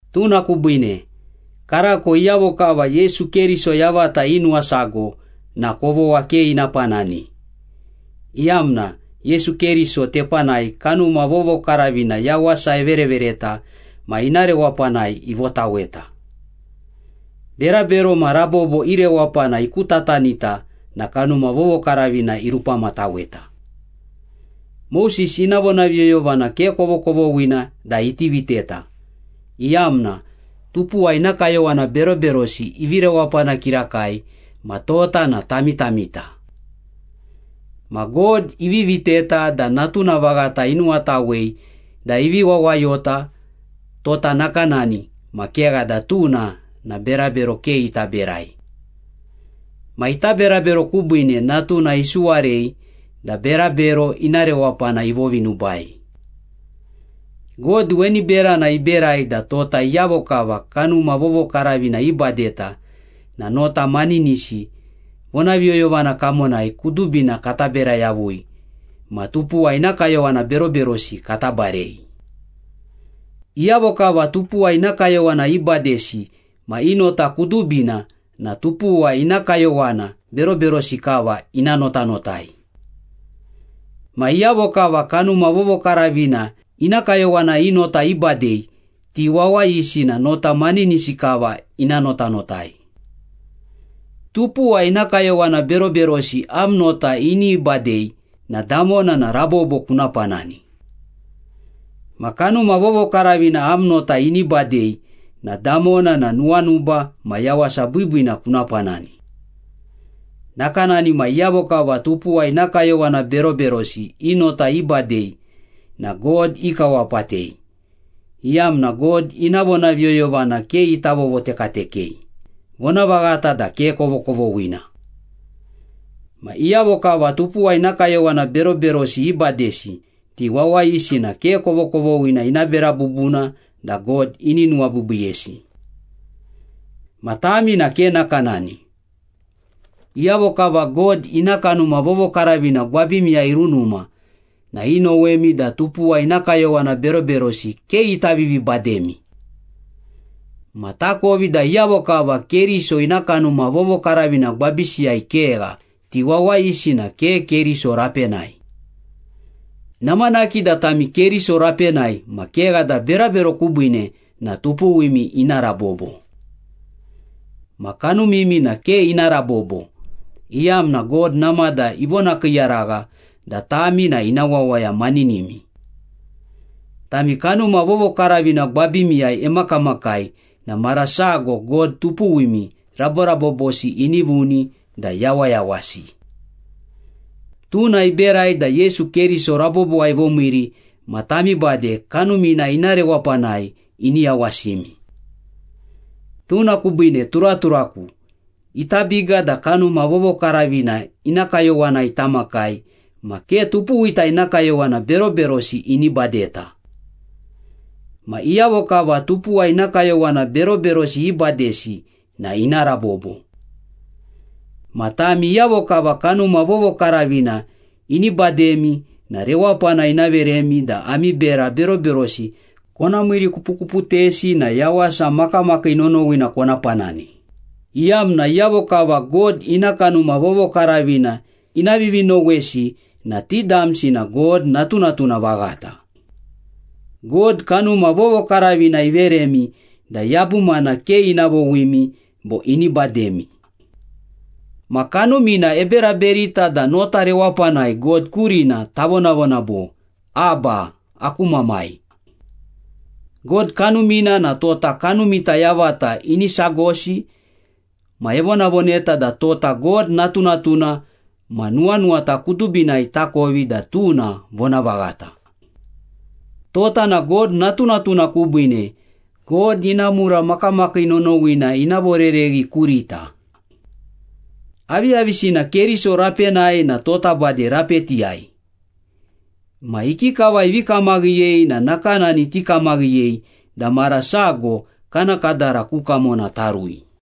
Tuna kubiine, karako iyavo kava Yesu Keriso yavata inuwasago na kovogha ke ina panani, iyamna Yesu Keriso tepanai Kanuma Vovokaravina yawasa everevereta ma ina rewapanai ivotaweta. Berabero ma rabobo i rewapana ikutatanita na Kanuma Vovokaravina irupamataweta. Moses ina vonaviyoyovana ke kovokovoghina da iti viteta, iyamna tupuwa ina kayowana beroberosi ivi rewapana kirakai ma tota na tamitamita. Ma God ivi viteta da Natuna vaghata inuwatawei da ivi wawayota tota nakanani, ma kegha da tuna na berabero ke ita berai. Ma ita berabero kubiine Natuna isuwarei da berabero ina rewapana ivovinubai. God weni berana iberai da tota iyavo kava Kanuma Vovokaravina ibadeta na nota maninisi vonaviyoyovana kamonai kudubina kata bera yavui ma tupuwa ina kayowana beroberosi kata barei. Iyavo kava tupuwa ina kayowana ibadesi na i nota kudubina na tupuwa ina kayowana beroberosi kava ina notanotai. Ma iyavo kava Kanuma Vovokaravina ina kayowana i nota ibadei, ti wawayisi na nota maninisi kava ina notanotai. Tupuwa ina kayowana beroberosi am nota ini badei na damona na rabobo kuna panani. Ma Kanuma Vovokaravina am nota ini badei na damona na nuwanuba ma yawasa biibiina kuna panani. Nakanani na iyavo kava tupuwa ina kayowana beroberosi i nota ibadei na God ikawapatei, iyamna God ina vonaviyoyovana ke ita vovotekatekei, vonavaghata da ke kovokovoghina. Ma iyavo kava tupuwa ina kayowana beroberosi ibadesi, ti wawayisi na ke kovokovoghina ina bera bubuna da God ini nuwabiibiiyesi. Ma tami na ke nakanani. Iyavo kava God ina Kanuma Vovokaravina gwabimiyai irunuma na inowemi da tupuwa ina kayowana beroberosi ke ita vivibademi. Ma takovi da iyavo kava Keriso ina Kanuma Vovokaravina gwabisiyai kegha, ti wawayisi na ke Keriso rapenai. Namanaki da tami Keriso rapenai ma kegha da berabero kubiine na tupuwimi ina rabobo. Ma kanumimi na ke ina rabobo, iyamna God namada ivonakiiyaragha da tami na ina wawaya maninimi. Tami Kanuma Vovokaravina gwabimiyai emakamakai na mara sago God tupuwimi raborabobosi ini vuni da yawayawasi. Tuna iberai da Yesu Keriso rabobowai ivomiiri ma tami bade Kanumina ina rewapanai ini yawasimi. Tuna kubiine turaturaku, ita biga da Kanuma Vovokaravina ina kayowanai tamakai ma ke tupuwita ina kayowana beroberosi ini badeta. Ma iyavo kava tupuwa ina kayowana beroberosi ibadesi na ina rabobo. Ma tami iyavo kava Kanuma Vovokaravina ini bademi na rewapana ina veremi da ami bera beroberosi kona miirikupukuputesi na yawasa makamakii nonowina kona panani, iyamna iyavo kava God ina Kanuma Vovokaravina ina vivinowesi na ti damsi na God natunatuna vaghata. God, Kanuma Vovokaravina iveremi da yabumana ke ina vowimi bo ini bademi. Ma Kanumina eberaberita da nota rewapanai God kurina tavonavona bo, “Abba, aku Mamai.” God Kanumina na tota kanumita yavata ini sagosi ma evonavoneta da tota God natunatuna ma nuwanuwata kudubinai takovi da tuna vonavaghata. Tota na God natunatuna kubiine, God ina mura makamakii nonowina ina vorereghi kurita. Aviyavisina Keriso rapenai na tota bade rapetiyai. Ma ikikava ivi kamaghiyei na nakanani tikamaghiyei da mara sago kana kadara ku kamona tarui.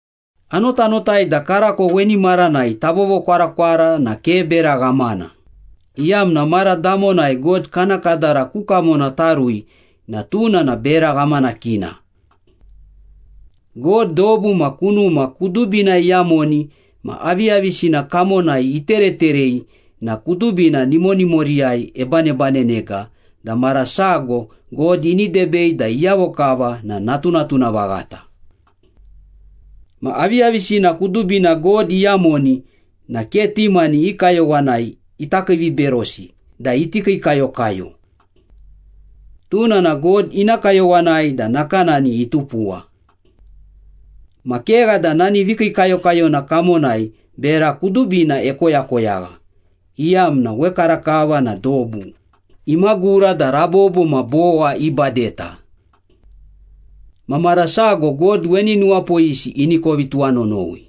Anotanotai da karako weni maranai tavovokwarakwara na ke bera ghamana, iyamna mara damonai God kana kadara ku kamona tarui na tuna na bera ghamanakina. God dobu ma kunuma kudubina iyamoni ma aviyavisina kamonai itereterei na kudubina nimonimoriyai ebanebanenega da mara sago God ini debei da iyavo kava na natunatuna vaghata. Ma aviyavisina kudubina God iyamoni na ke ti mani i kayowanai ita kiiviberosi da iti kiikayokayo. Tuna na God ina kayowanai da nakanani itupuwa. Ma kegha da nani vikiikayokayona kamonai, bera kudubina ekoyakoyagha, iyamna wekarakava na dobu imagura da rabobo ma bowa ibadeta. Ma mara sago God weni nuwapoyisi ini kovi tuwanonowi.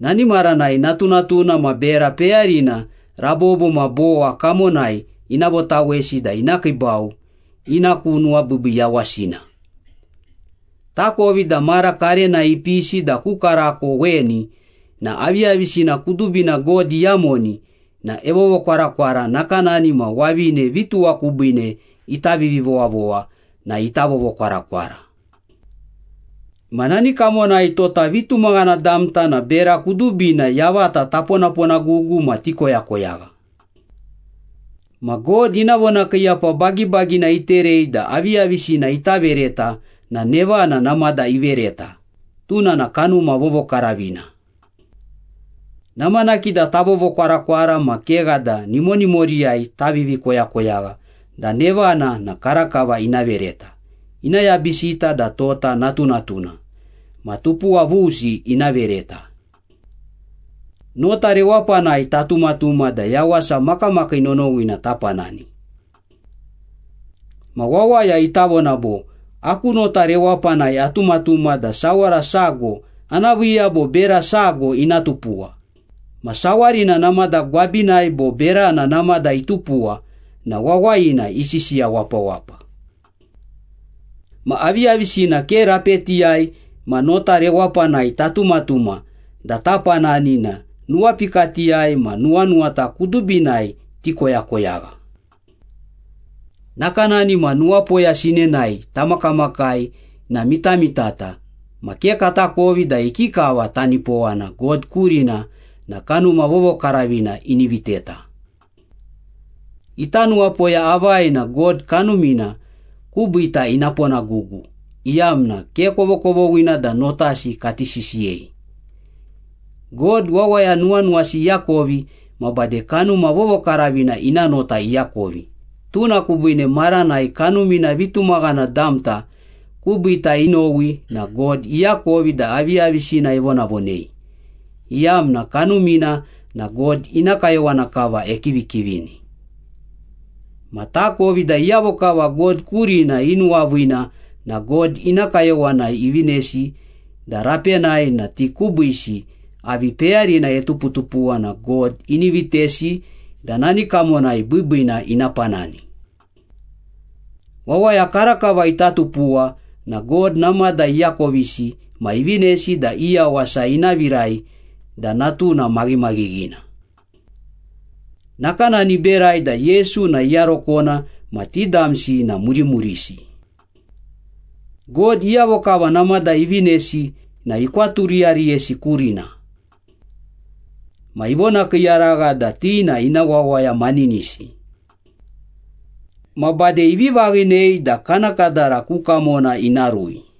Nani maranai natunatuna ma bera peyarina rabobo ma bowa kamonai ina votawesi da ina kiibau ina ku nuwabiibii yawasina. Takovi da mara karenai ipisi da ku karako weni na aviyavisina kudubina God iyamoni na evovokwarakwara nakanani ma wavine vituwa kubiine ita vivivowavowa na ita vovokwarakwara. Ma nani kamonai tota vitumaghana damta na bera kudubina yavata taponaponagugu ma tikoyakoyagha. Ma God ina vonakiiyapa bagibagina iterei da aviyavisina ita vereta na nevana namada ivereta, tuna na Kanuma Vovokaravina. Namanaki da tavovokwarakwara ma kegha da nimonimoriyai tavivi koyakoyagha da nevana na karakava ina vereta, ina yabisita da tota natunatuna, ma tupuwa vusi ina vereta. Nota rewapanai tatumatuma da yawasa makamakii nonowina tapanani. Ma wawaya ita vona bo, “Aku nota rewapanai atumatuma da sawara sago ana viiya bo bera sago ina tupuwa,” ma sawarina namada gwabinai bo berana namada itupuwa na wawayina isisiya wapawapa. Ma aviyavisina ke rapetiyai ma nota rewapanai tatumatuma da tapanani na nuwapikatiyai ma nuwanuwata kudubinai tikoyakoyagha. Nakanani ma nuwapoya sinenai tamakamakai na mitamitata ma ke katakovi da ikikava tanipowana God kurina na Kanuma Vovokaravina ini viteta. Ita nuwapoya avai na God Kanumina kubiita ina ponagugu, iyamna ke kovokovoghina da notasi kati sisiyei. God wawaya nuwanuwasi iakovi ma bade Kanuma Vovokaravina ina nota iakovi, tuna kubiine maranai Kanumina vitumaghana damta kubiita inowi na God iakovi da aviyavisina evonavonei, iyamna Kanumina na God ina kayowana kava ekivikivini. Ma takovi da iyavo kava God kurina inuwaviina na God ina kayowanai ivinesi da rapenai na ti kubiisi avi peyarina etuputupuwa na God ini vitesi da nani kamonai biibiina ina panani. Wawaya karakava ita tupuwa na God namada iakovisi ma ivinesi da i yawasa ina virai da Natuna maghimaghinina. Nakanani iberai da Yesu na iyarokona ma ti damsi na murimurisi. God iyavo kava namada ivinesi na ikwaturiyariyesi kurina. Ma ivonakiiyaragha da ti na ina wawaya maninisi. Ma bade ivi vaghinei da kana kadara ku kamona ina rui.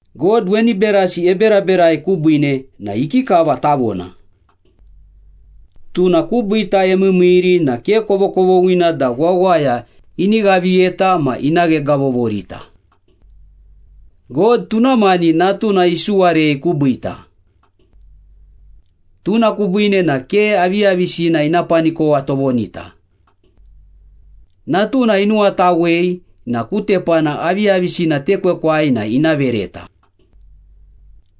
God weni berasi eberaberai kubiine na ikikava tavona? Tuna kubiita emiimiiri na ke kovokovoghina da wawaya ini ghaviyeta ma ina ghegavovorita. God tuna mani Natuna isuwarei kubiita. Tuna kubiine na ke aviyavisina ina panikowa tovonita. Natuna inuwatawei na ku tepana aviyavisina tekwekwai na ina vereta.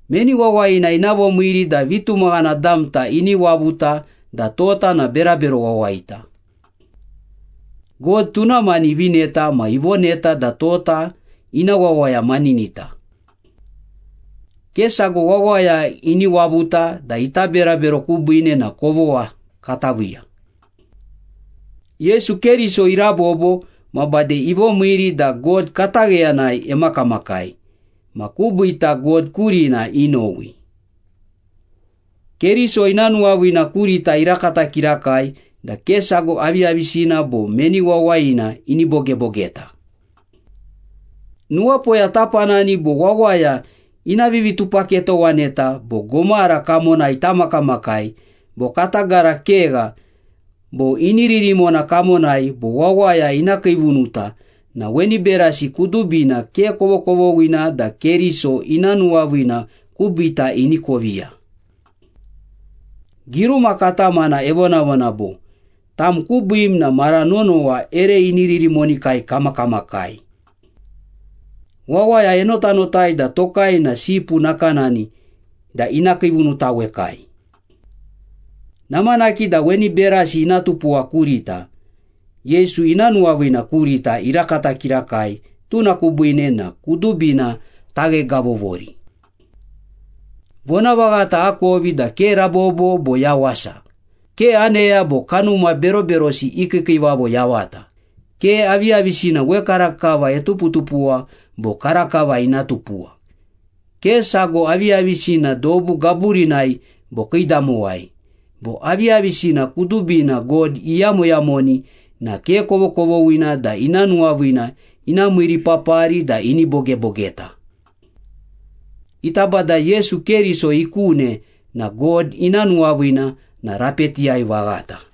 Meni wawayina ina vomiiri da vitumaghana damta ini wavuta da tota na berabero wawayita? God tuna mani ivineta ma ivoneta da tota ina wawaya maninita. Ke sago wawaya ini wavuta da ita berabero kubiine na kovogha kata viiya. Yesu Keriso irabobo ma bade ivomiiri da God katagheyanai emakamakai, ma kubiita God kurina inowi. Keriso ina nuwaviina kurita irakata kirakai da ke sago aviyavisina bo meni wawayina ini bogebogeta. Nuwapoya tapanani bo wawaya ina vivitupaketowaneta bo gomara kamonai tamakamakai bo kata gara kegha bo iniririmona kamonai bo wawaya ina kiivunuta na weni berasi kudubina ke kovokovoghina da Keriso ina nuwaviina kubiita ini koviya. Giruma katamana evonavona bo, “Tam kubiim na mara nonowa ere iniririmonikai kamakamakai. Wawaya enotanotai da tokai na sipu nakanani da ina kiivunutawekai.” Namanaki da weni berasi ina tupuwa kurita, Yesu ina nuwaviina kurita irakata kirakai, tuna kubiine na kudubina taghegavogavovori. Vonavaghata akovi da ke rabobo bo yawasa, ke aneya bo kanuma beroberosi i kiikiivavo yavata, ke aviyavisina wekarakava etuputupuwa bo karakava ina tupuwa, ke sago aviyavisina dobu gaburinai bo kiidamowai, bo aviyavisina kudubina God iyamoyamoni na ke kovokovoghina da ina nuwaviina ina miiripapari da ini bogebogeta. Ita Bada Yesu Keriso ikune na God ina nuwaviina na rapetiyai vaghata.